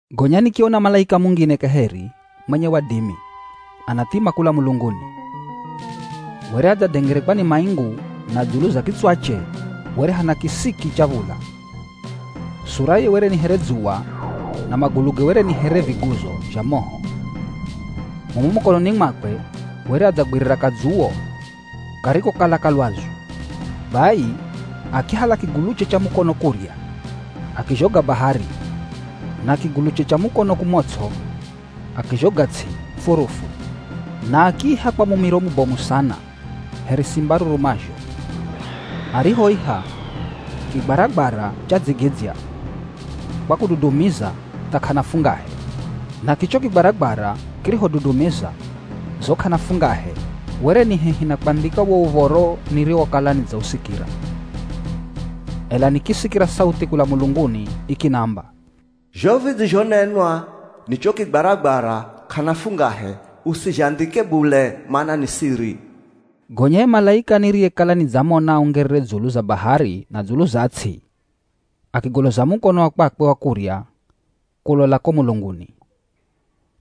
Gonya nikiona malaika mungine kaheri mwenye wadimi anathima kula mulunguni. Were adzadengerekwa ni maingu na dzulu za kitswache were hana kisiki cha v̱ula. Suraye were ni here dzuwa na maguluge were ni here viguzo zha moho. Mumo mukononi mwakwe were adzagwirira kadzuwo karikokala ka lwazu. Bai, akihala kiguluche cha mukono kurya akizhoga bahari na kiguluche cha mukono kumots'o akizhoga ts'i furufu. Na akiiha kwa mumiro mubomu sana here simba arurumazho. Arihoiha, kigwaragwara chadzigidzya kwa kududumiza tha k'ana fungahe. Na kicho kigwaragwara kirihodudumiza zo k'ana fungahe were ni hehi na kwandhika wo uv̱oro niriwokala nidzausikira. Ela nikisikira sauthi kula mulunguni ikinamba, “Zho vidzizhonenwa ni cho kigwaragwara k'ana fungahe usizhandhike bule mana ni siri.” Gonya ye malaika niriyekala nidzamona aungerere dzulu za bahari na dzulu za ts'i, akigoloza mukono wa kwakwe wa kurya kulola ko mulunguni.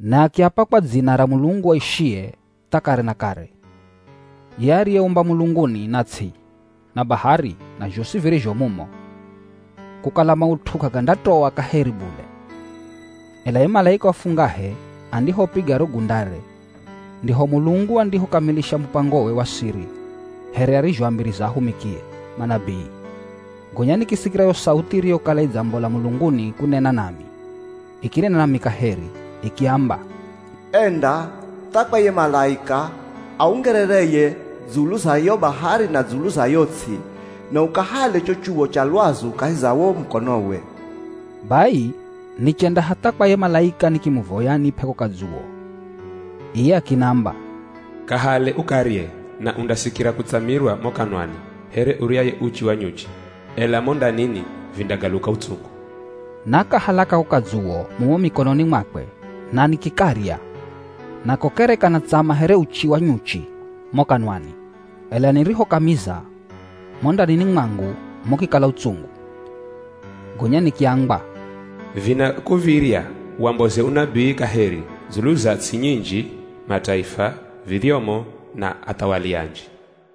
Na akiapa kwa dzina ra Mulungu aishiye tha kare na kare, ye ariyeumba mulunguni na ts'i, na bahari na zhosi virizho mumo, kukala maut'u k'agandatoa kaheri bule. Ela ye malaika wa fungahe andihopiga ro gundare ndiho Mulungu andihokamilisha mupangowe wa siri here arizhoambiriza ahumikie, manabii. Gonya nikisikira yo sauthi iriyokala idzambola mulunguni kunena nami, ikinena nami kaheri ikiamba, “Enda tha kwa ye malaika aungerereye dzulu za yo bahari na dzulu za yo ts'i, na ukahale cho chuwo cha lwazu kahi za wo mukonowe.” Bai nichenda hatha kwa ye malaika nikimuvoya anip'e ko kadzuwo. Iye akinamba, “Kahale ukarye na undasikira kutsamirwa mo kanwani here uryaye uchi wa nyuchi, ela mo ndanini vindagaluka utsungu.” Nakahala kako kadzuwo mumo mikononi mwakwe na nikikarya. Nako kere kanatsama here uchi wa nyuchi mo kanwani, ela nirihokamiza, mo ndanini mwangu mukikala utsungu. Gonya nikiambwa, “Vinakuv̱irya wamboze unabii kaheri dzulu za ts'i nyinji, mataifa, vidhyomo na athawali anji.”